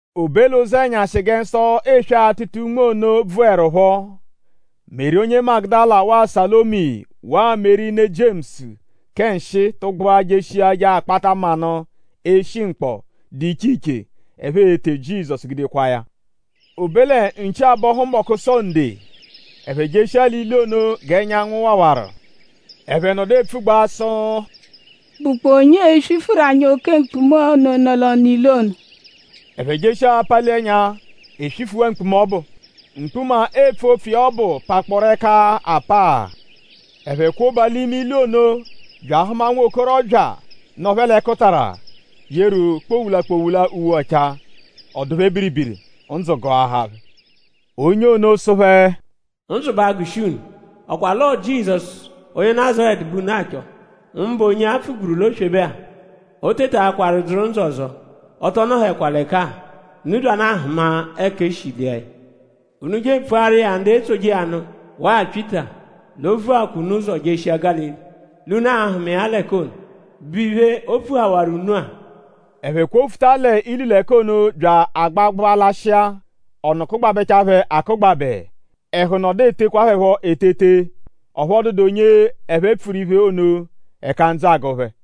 O be l'ụzenyashi gẹ nsọ eswe-atụta-unme ono bvụerupho; Meri onye Magudala waa Salomi waa Meri ne Jiemusu kẹ nshịi tụgbua jeshia je akpata manụ, eshi mkpọ, dụ iche iche, ẹphe e-te Jizọsu gude kwaa ya. O be lẹ nchi abọhu mbọchi Sonde; ẹphe jeshia l'ilu ono g'ẹnyanwu wawaru. Ẹphe nọdu epfugbaa sụ: “?Bụkpoo onye e-swifuru anyi oke mkpuma ono, nọ l'ọnu ilu ono?” Ẹphe jeshia apali ẹnya; e swifuwaa mkpuma ọbu. Mkpuma, eepfu opfu iya ọbu pakpọoru ẹka apaa. Ẹphe kwoba l'ime ilu ono; bya ahụma nwokorọbya, nọ phẹ l'ẹkutara, yeru kpowula-kpowula uwe ọchaa. Ọ dụ phẹ biribiri; ndzụ gụahaa phẹ. Onye ono sụ phẹ: “Ndzụ ba agụshi unu.?Ọ kwa l'ọo Jizọsu onye Nazaretu bẹ unu achọ; mbụ onye-a, a pfugburu l'oswebe-a? O tetaakwaru dzụru ndzụ ọzo! Ọ tọ nọhekwa l'ẹka-a. Unu byanụ ahụma ẹka e shi lia ya. Unu je epfuaru iya ndu etsoje iya nụ waa Pyịta l'o vuwaa unu ụzo jeshia Gálili; l'unu a-hụma iya l'ẹka ono, bụ iphe, o pfuhawaru unu-a.” Ẹphe kwofụta l'ilu l'ẹka ono bya agbagbụa lashịa. Ọnu kụgbabechaa phẹ akụgbabe. Ẹhu nọdu etekwa phẹ phọ etete. Ọphu ọ dụdu onye ẹphe pfuru iphe ono; ẹka ndzụ agụ phẹ.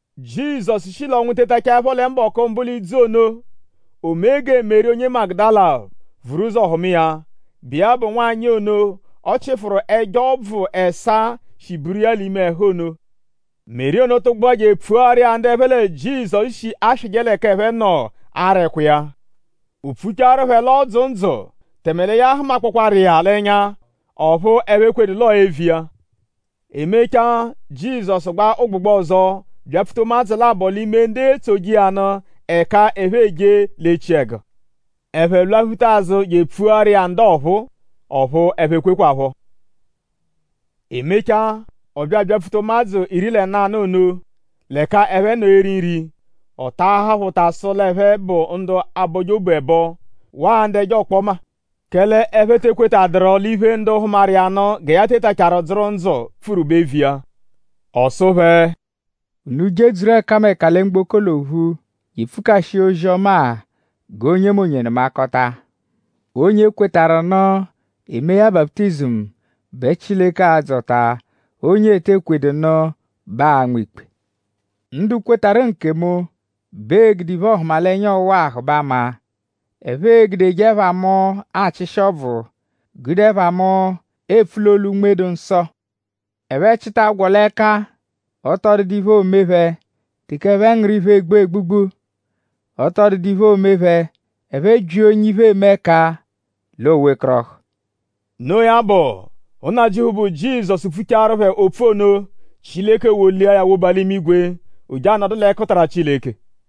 Jizọsu shi l'ọnwu tetachaẹpho lẹ mbọku mbụ l'idzu ono; o mee gẹ Meri onye Magudala vuru ụzo hụma iya, bụ iya bụ nwanyị ono, ọ chịfuru ẹjo ọbvu ẹsaa, shi buru iya l'ime ẹhu ono. Meri ono tụgbua je epfuaru iya ndu ẹphe lẹ Jizọsu shi aswịje l'ẹka ẹphe nọ ara ẹkwa iya. O pfuchaaru phẹ l'ọ dzụ ndzụ; tẹme lẹ ya hụmakpooru iya l'ẹnya; ọphu ẹphe ekwedu l'ọo eviya. E mechaa; Jizọsu gbaa ụgbugba ọzo byapfuta ụmadzu labọ l'ime ndu etsoje iya nụ l'ẹka ẹphe eje l'echiẹgu. Ẹphe lwaphuta azụ je epfuaru iya ndu ọphuu; ọphu ẹphe ekwekwaphọ. E mechaa; ọ bya abyapfuta ụmadzu iri lẹ nanụ ono; l'ẹka ẹphe eri nri. Ọ taahaa phẹ ụta sụ l'ẹphe bụ ndu abọje obu ẹbo; waa ndu ẹjo ọkpoma; kẹle ẹphe te ekwetadụru l'iphe, ndu hụmaru iya nụ gẹ ya tetachaaru dzụru ndzụ pfuru bụ eviya. Ọ sụ phẹ: “Unu jedzuru ẹkameka lẹ mgboko l'ophu je epfukashia ozi-ọma-a g'onyemonye nụmakota. Onye kwetarụ nụ; e mee ya baputizimu bẹ Chileke aa-dzọta. Onye ete ekwedu nụ bẹ aa-nma ikpe. Ndu kwetarụ nkemu bẹ ee-gude iphe-ọhumalenya ọwa-a hụbe ama. Ẹphe e-gudeje ẹpha mu achịshi ọbvu; gude ẹpha mu epfu l'olu Unme-dụ-Nsọ. Ẹphe -chịta agwọ l'ẹka; ọ tọ dụdu iphe, oo-me phẹ. Teke ẹphe ngụru iphe, egbu egbugbu; ọ tọ dụdu iphe, oo-me phẹ. Ẹphe -byia onye iphe eme ẹka l'o-wekọrohu.” Noo ya bụ; Nnajịuphu, bụ Jizọsu pfuchaaru phẹ opfu ono; Chileke wolia ya woba l'imigwe. O je anọdu l'ẹkutara Chileke.